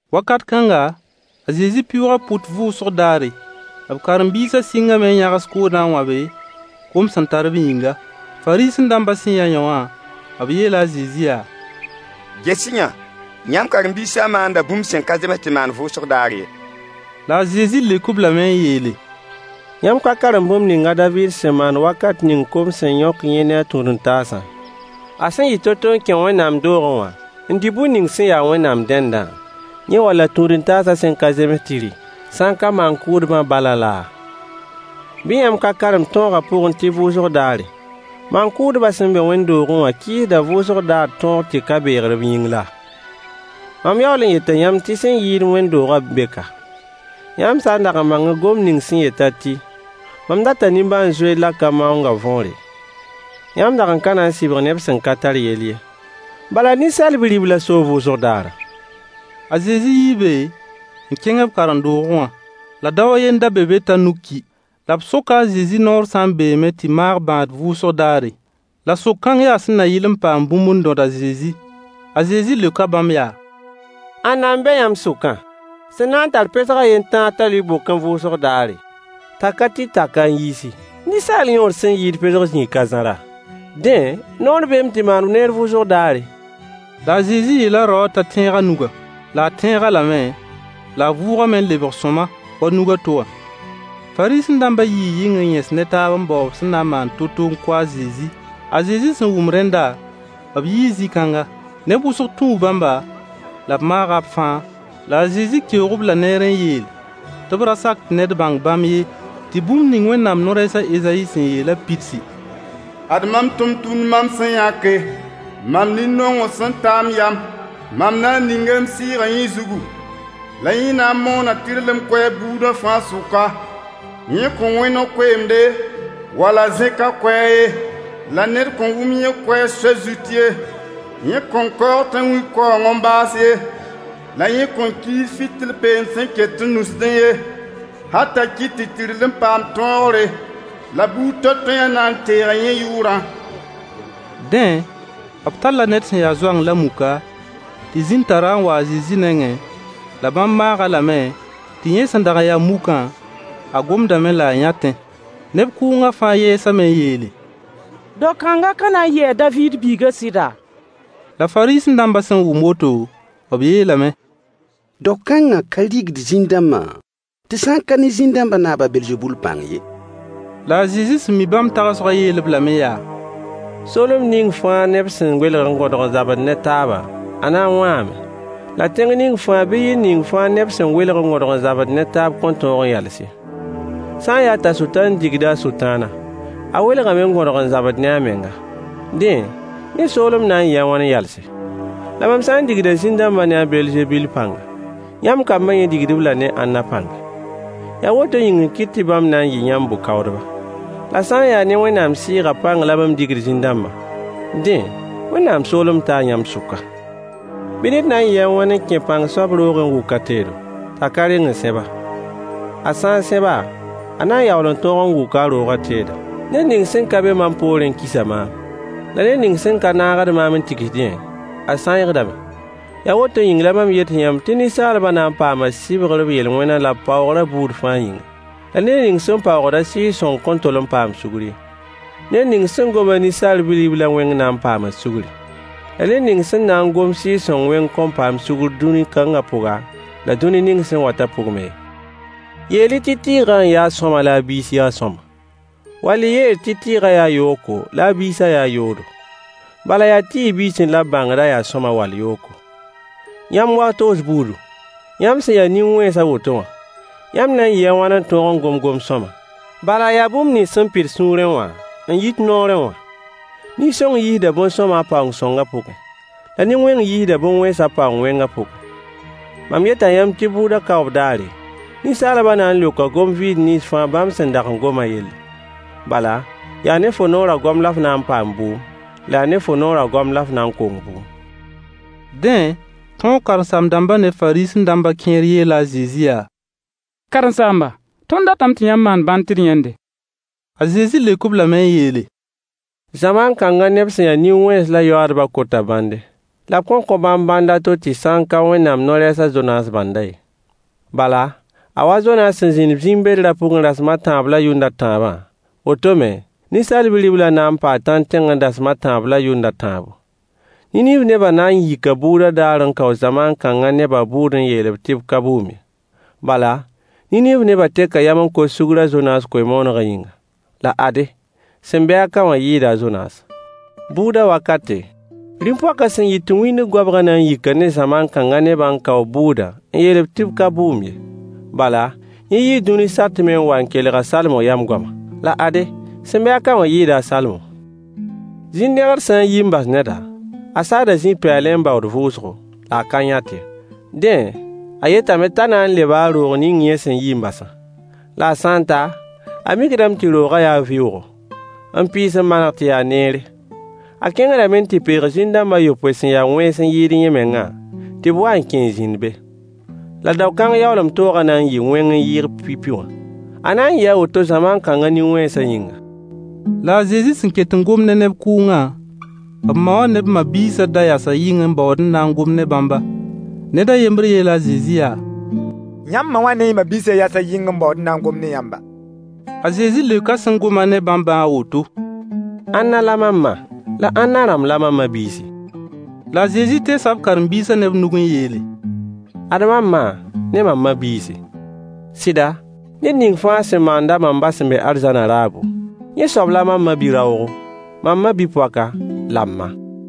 Wakat kãnga, a Zezi pɩʋʋga pʋt vʋʋsg daare. B karen-biisã sɩngame n yãgs koodã n wãbe, kom sẽn tar-b yĩnga. Fariisẽ-dãmbã sẽn yã yõwã, b yeela a Zezi yaa: Ges-y-yã! Yãmb karen-biisã maanda bũmb sẽn ka zems tɩ maan vʋʋsg daar ye. La a Zezi leok-b lame n yeele: Yãmb ka karem bũmb ning a David sẽn maan wakat ning kom sẽn yõk yẽ ne a tũud-n-taasã, a sẽn yɩ to-to n kẽ Wẽnnaam doogẽ wã n dɩ bur ning sẽn ya Wẽnnaam dendã, yẽ wall a tũud-n-taasã sẽn ka zems tɩ rɩ, sã n ka maan-kʋʋdbã balã laa? Bɩ yãmb ka karem tõogã pʋgẽ tɩ vʋʋsg daare, maan-kʋʋdbã sẽn be wẽnd-doogẽ wã kɩɩsda vʋʋsg daar tõog tɩ ka beegr b yĩng laa? Mam yaool n yeta yãmb tɩ sẽn yɩɩd wẽnd-doogã n be ka. Yãmb sã n dag n bãngẽ gomd ning sẽn yet-a tɩ: “Mam data nimbãan-zoeer la ka maoongã” võore, yãmb dag n ka na n sɩbg neb sẽn ka tar yell ye. Bala Ninsaal Bi-riblã soo vʋʋsg daarã. A Zezi yii be n kẽng b karen-doogẽ wã. La dao a yen n da be be t'a nug ki. La b soka a Zezi noor sã n beeme tɩ maag bãad vʋʋsg daare. La sok-kãng yaa sẽn na yɩl n paam bũmb n dõd a Zezi. A Zezi leoka bãmb yaa: Ãnna n be yãmb sʋkã sẽn na n tar pesg a yen tãa t'a lʋɩ bokẽ vʋʋsg daare, t'a ka tɩ tak-a n yiisi? Ninsaal yõod sẽn yɩɩd pesg zĩig ka zãra? Dẽ, noor beeme tɩ maan neer vʋʋsg daare. La a Zezi yeela raowã t'a tẽeg a nugã. La a tẽeg-a lame, la a vʋʋgame n lebg sõama wa nug a to wã. Fariisẽ-dãmbã yii yɩng n yẽs ne taab n bao b sẽn na n maan to-to n kʋ a Zezi. A Zezi sẽn wʋm rẽnda, b yii zĩ-kãnga. Neb wʋsg tũu bãmba, la b maaga b fãa. La a Zezi keoog-b-la neer n yeel tɩ b ra sak tɩ ned bãng bãmb ye, tɩ bũmb ning Wẽnnaam no-rɛɛs a Ezayi sẽn yeelã pidsi: Ad mam tʋmtʋmd mam sẽn yãke, mam nin-nongr sẽn ta m yam. Mam na n ninga m Sɩɩgã yẽ zugu, la yẽ na n moona tɩrlem koɛɛg buudã fãa sʋka. Yẽ kõn wẽ no-koeemde wall a zẽk a koɛɛg ye, la ned kõn wʋm yẽ koɛɛg soay zut ye. Yẽ kõn kaoog tãnwĩ-kaoong n baas ye, la yẽ kõn kiis fɩtɩl peend sẽn ket n nusd ye, hal t'a kɩt tɩ tɩrlem paam tõogre. La buud toay-toayã na n teega yẽ yʋʋrã. Dẽ, b talla ned sẽn ya zoang la muka tɩ zĩn tar-a n wa a Zezi nengẽ, la bãmb maag-a lame, tɩ yẽ sẽn dag n ya mukã, a gomdame la a yãtẽ. Neb kʋʋngã fãa yɛɛsame n yeele: Dao-kãngã ka na n yɩ a David biigã sɩda? La Fariisẽ-dãmbã sẽn wʋm woto, b yeelame: Dao-kãngã ka rigd zĩn-dãmbã tɩ sã n ka ne zĩn-dãmbã naab a Belzebul pãng ye. La a Zezi sẽn mi bãmb tagsgã yeel-b lame yaa: Soolem ning fãa neb sẽn welg n gõdg n zabd ne taaba, a na n wãame. La tẽng ning fãa bɩ yir ning fãa neb sẽn welg n gõdg n zabd ne taab kõn tõog n yals ye. Sã n yaa t'a Sʋtãan digda a Sʋtãana, a welgame n gõdg n zabd ne a menga. Dẽ, yẽ soolem na n yɩɩ a wãn n yalse? La mam sã n digda zĩn-dãmbã ne a Belzebul pãnga, yãmb kambã yẽ digd-b-la ne ãnna pãnga? Yaa woto yĩng n kɩt tɩ bãmb na n yɩ yãmb bʋ-kaoodba. La sã n yaa ne Wẽnnaam Sɩɩgã pãng la mam digd zĩn-dãmbã, dẽ, Wẽnnaam soolem taa yãmb sʋka. Bɩ ned na n yɩɩ a wãn n kẽ pãng soab roogẽ n wʋk a teedo, t'a ka reng n sẽb-a? A sã n sẽb-a, a na yaool n tõog n wʋk a roogã teedã. Ned ning sẽn ka be mam poorẽ kisa maam, la ned ning sẽn ka naagd maam n tigsdẽ, a sãeegdame. Yaa woto yĩng la mam yet yãmb tɩ ninsaalbã na n paama sugr b yel-wẽnã la b paoogrã buud fãa yĩnga. La ned ning sẽn paoog-a Sɩɩg-sõng kõn tol n paam sugr ye. Ned ning sẽn gom-a Ninsaal Bi-riblã wẽng na n paama sugri. La ned ning sẽn na n gom Sɩɩg-sõng wẽng kõn paam sugr dũni-kãnga pʋga, la dũni ning sẽn watã pʋg me ye. Yeel-y tɩ tɩɩgã n ya sõama la a biis ya sõama, wall y yeel tɩ tɩɩgã yaa yooko la a biisã yaa yoodo. Bala yaa tɩɩg biisẽ la b bãngd a yaa sõama wall yooko. Yãmb wag-toos buudu, yãmb sẽn ya nin-wẽns a woto wã, yãmb na n yɩɩ a wãn n tõog n gom gom-sõama? Bala yaa bũmb nins sẽn pid sũurẽ wã n yit noorẽ wã. Nin-sõng yiisda bõn-sõama a paoon-sõngã pʋgẽ. La nin-wẽng yiisda bõn-wẽns a paoon-wẽngã pʋgẽ. Mam yeta yãmb tɩ bʋʋdã kaoob daare, ninsaalbã na n leoka gom-vɩɩd nins fãa bãmb sẽn dag n gomã yelle. Bala yaa ne fo noorã goam la f na n paam bʋʋm, la yaa ne fo noorã goam la f na n kong bʋʋm. Dẽ, tõog karen-saam-dãmbã ne Fariisẽ-dãmbã kẽer yeela a Zezi yaa: Karen-saamba, tõnd datame tɩ yãmb maan bãnd tɩ d yãnde. A Zezi leok-b lame n yeele: Zamaan kãngã neb sẽn ya nin-wẽns la yoaadbã kota bãnde, la b kõn kõ bãmb bãnd a to tɩ sã n ka Wẽnnaam no-rɛɛs a Zonaas bãndã ye. Bala, a wa a Zonaas sẽn zĩnd zĩm-bedrã pʋgẽ rasem a tãab la yʋnd a tãabã, woto me, Ninsaal Bi-riblã na n paa tãnd tẽngr dasem a tãab la yʋnd a tãabo. Niniiv nebã na n yika bʋʋdã daar n kao zamaan kãngã nebã bʋʋd n yeel tɩ b ka bʋʋm ye. Bala Niniiv nebã teka yam n kos sugr a Zonaas koe-moonegã yĩnga. La ade, sẽn be-a ka wã yɩɩda a Zonaase. Bʋʋdã wakate, rĩm-poakã sẽn yit wĩndg goabgã na n yika ne zamaan kãngã nebã n kao b bʋʋd n yeel tɩ b ka bʋʋm ye. Bala, yẽ yii dũni satmẽ n wa n kelg a Salomo yam goama. La ade, sẽn be-a ka wã yɩɩda a Salomo. Zĩn-dẽgd sã n yi n bas neda, a saada zĩ-pɛɛlẽ n baood vʋʋsgo, la a ka yãt ye. Dẽ, a yetame t'a na n leba a roog ning yẽ sẽn yi n basã. La a sã n ta, a mikdame tɩ roogã yaa vɩʋʋgo, n pɩɩs n maneg tɩ ya neere. A kẽngdame n tɩ peeg zĩn-dãmb a yopoe sẽn ya wẽns n yɩɩd yẽ mengã tɩ b wa n kẽ n zĩnd be. La dao-kãng yaoolem toogã na n yɩɩ wẽng n yɩɩg pipi wã. A na n yɩɩ a woto zamaan kãngã nin-wẽnsã yĩnga. La a Zezi sẽn ket n gomd ne neb kʋʋngã, b ma wã ne b ma-biisã da yasa yɩng n baood n na n gom ne bãmba. [ Ned a yembr yeela a Zezi yaa: Yãmb ma wã ne y ma-biisã yasa yɩng n baood n na n gom ne yãmba.] A Zezi leoka sẽn gom-a ne bãmbã a woto: Ãnna la mam ma, la ãnna rãmb la mam ma-biisi? La a Zezi teesa b karen-biisã ne b nug n yeele: Ad mam ma ne mam ma-biisi. Sɩda, ned ning fãa sẽn maand-a mam Ba sẽn be arzãnã raabo, yẽ soab la mam ma-bi-raoogo, mam ma-bi-poaka la m ma.